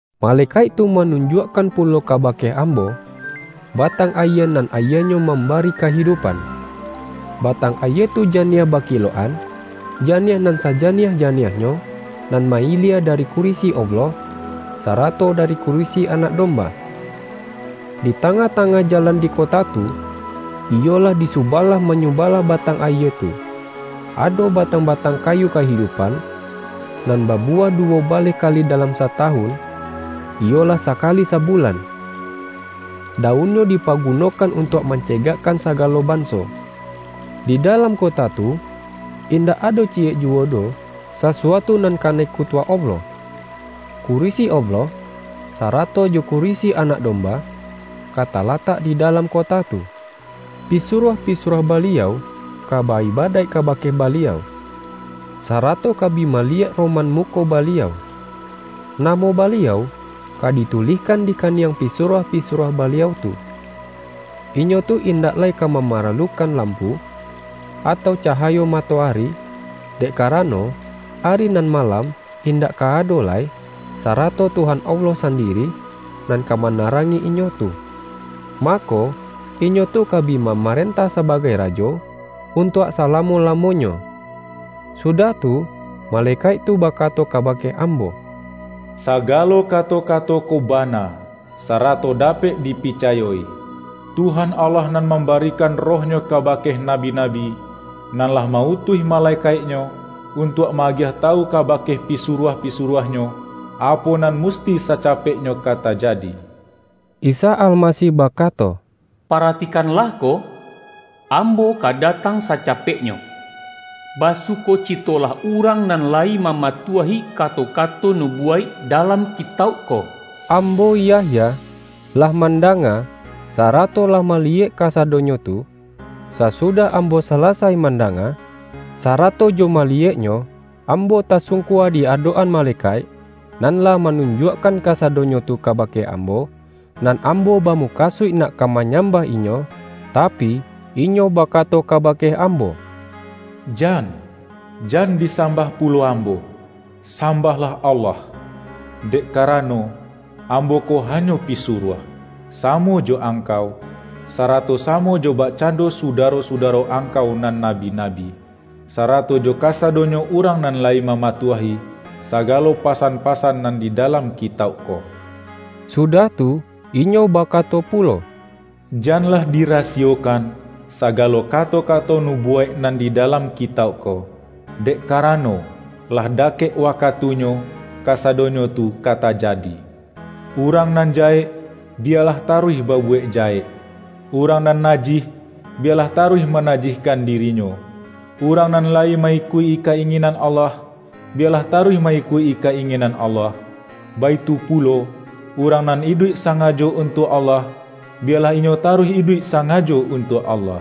Malekaik tu manunjuakkan pulo kabake ambo, batang ayie nan ayienyo mambari kahidu-pan. Batang ayie tu janiah bakilok-an, janiah nan sajaniah-janiahnyo, nan ma-ilie dari kurisi Allah, sarato dari kurisi Anak Domba. Di tangah-tangah jalan di kota tu, iyolah, di subalah-manyubalah batang ayie tu, ado batang-batang kayu kahidupan, nan babuwah duwo baleh kali dalam satawun, iyolah sakali sabulan. Daun-nyo dipagunokan untuak mancegakkan sagalo banso. Di dalam kota tu, indak ado ciyek juwo doh sasuatu nan kanai kutuak Allah. Kurisi Allah, sarato jo kurisi Anak Domba, ka talatak di dalam kota tu. Pisuruah-pisuruah Baliau ka ba-iba-daik kabake Baliau, sarato ka bi maliyek roman muko Baliau. Namo Baliau, ka ditulihkan di kaniang pisu-ruah-pisuruah Baliau tu. Inyo tu in-dak lai ka mamaralukan lampu, atau cahayo matoari, dek karano, ari nan malam indak ka ado lai, sarato Tuhan Allah sandiri, nan ka manarangi inyo tu. Mako, inyo tu ka bi mamarentah sabagai rajo, untuak salamo-lamo-nyo. Sudah tu, malekaik tu bakato ka-bake ambo,”Sagalo kato-kato ko ba-na, sarato dapek dipicayo-i. Tuhan Allah nan mambarikan Roh-Nyo ka-bake nabi-nabi, nan lah ma-utuih ma-lekaik-Nyo, untuak ma-agiah tawu ka-bake pisuruah-pisuruah-Nyo, apo nan musti sacapeknyo ka tajadi.” Isa Almasih bakato,”Paratikan-lah ko! Ambo ka datang sacapeknyo. Basukocitolah urang nan layi mama-tuahi kato-kato nubuwaik dalam ki-tauk ko!” Ambo, Yahya, lah mandanga, sa-rato lah maliyek kasadonyo tu. Sa-sudah ambo salasai mandanga, sara-to jo maliyeknyo, ambo tasungkua di adok-an malekaik, nan lah manun-juakkan kasadonyo tu kabake ambo, nan ambo bamukasuik nak ka ma-nyambah inyo, tapi, inyo bakato ka-bake ambo,”Jan! Jan disambah pulo ambo! Sambahlah Allah! Dek kara-no, ambo ko hanyo pisuruah, samo jo angkau, sarato samo jo bakcando sudaro-sudaro angkau nan nabi-nabi, sarato jo kasadonyo urang nan layi mamatuahi, sagalo pasan-pasan nan di dalam kitauk ko!” Sudah tu, inyo bakato pulo,”Janlah dirasiyokan, sa-galo kato-kato nubuwaik nan di da-lam kitauk ko, dek karano, lah dakek wakatunyo, kasadonyo tu ka tajadi. Urang nan jahek, biyalah taruih ba-buwek jahek; urang nan najih, biya-lah taruih manajihkan dirinyo; urang nan layi ma-ikuik-i ka-inginan Allah, biyalah taruih ma-ikuik-i ka-inginan Allah, baitu pulo, urang nan iduik sa-ngajo untuak Allah, biyalah inyo ta-ruih iduik sangajo untuak Allah.”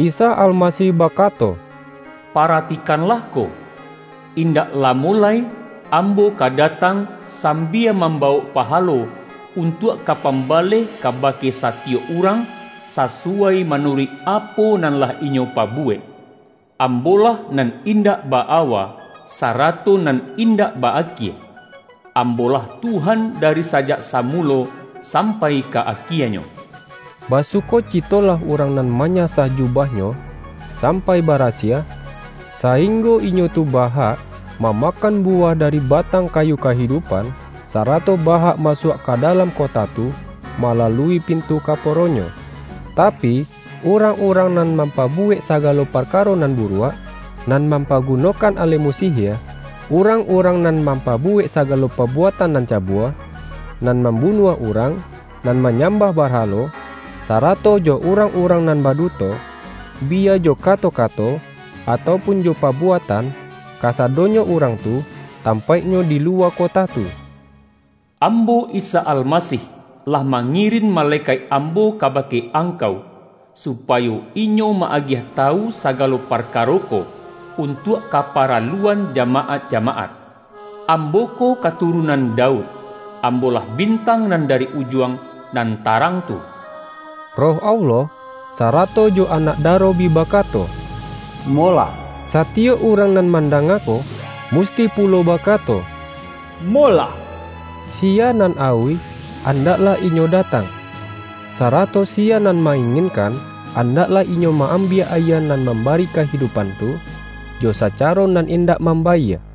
Isa Almasih bakato,”Paratikanlah ko! Indak lamo lai Ambo ka datang, sambia mambawok pahalo, untuak ka pambaleh kabake satiyok urang, sasu-wai manuruik apo nan lah inyo pabu-wek. Ambo-lah nan indak ba-awa, sarato nan indak ba-akie; Ambo-lah Tuhan dari sajak Samulo, sampai ka Akienyo.” Basukocitolah urang nan manya-sah jubahnyo sampai barasiah, sa-inggo inyo tu ba-hak, mamakan bu-wah dari batang kayu kahidupan, sarato ba-hak masuak ka dalam kota tu, malalui pintu kaporonyo. Tapi, urang-urang nan mampabuwek saga-lo parkaro nan buruak, nan mampa-gunokan alemu sihie, urang-urang nan mampabuwek sagalo pabuatan nan cabua, nan mambunuah urang, nan manyambah barhalo, sarato jo urang-urang nan baduto, biya jo ka-to-kato, atau pun jo pabuatan, kasa-donyo urang tu, tampaiknyo di luwa kota tu. ”Ambo, Isa Almasih, lah mangi-rin malekaik Ambo kabake angkau, supayo inyo ma-agiah tawu sagalo parkaro ko, untuak kaparaluan ja-maat-jamaat. Ambo ko katurunan Daud; Ambo-lah Bintang Nan Da-ri Ujuang, nan tarang tu.” Roh Allah, sarato jo Anak Daro bi bakato,”Molah!” Satiyok urang nan mandanga ko, musti pulo baka-to,”Molah!” Siya nan auih, andak-lah inyo datang! Sarato siya nan ma-inginkan, andaklah inyo ma-ambiak ayie nan mambari kahidupan tu, jo sacaro nan indak mambayie.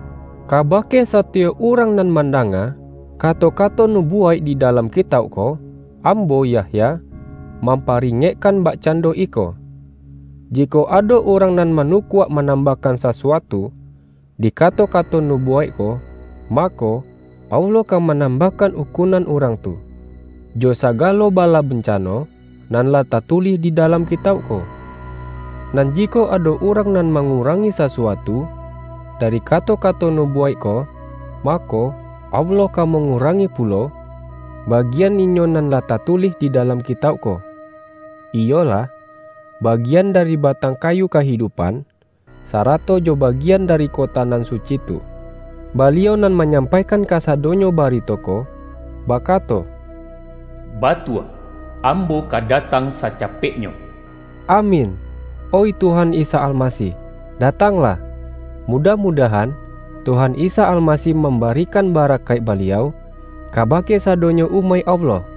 Kabake satiyok urang nan man-danga, kato-kato nubuwaik di da-lam kitauk ko, ambo, Yahya, mam-paringekkan bakcando iko: jikok ado urang nan manukuak manambahkan sasuatu, di kato-kato nubuwaik ko, mako, Allah ka manambahkan ukun-an urang tu, jo sagalo bala bancano nan lah tatulih di dalam kitauk ko. Nan jikok ado urang nan mangu-rangi sasuatu, dari kato-kato nubu-waik ko, mako, Allah ka mangurangi pulo, bagian inyo nan lah tatulih di dalam kitauk ko --- iyolah, bagian dari batang kayu kahidupan, sarato jo ba-gian dari kota nan suci tu. Baliau nan manyampaikan ka-sadonyo barito ko, bakato,”Ba-tua, Ambo ka datang sacapeknyo!” Amin! Oih Tuhan Isa Almasih, datang-lah! Mudah-mudahan, Tuhan Isa Alma-sih mambarikan barakaik Baliau, kaba-ke sadonyo umaik Allah!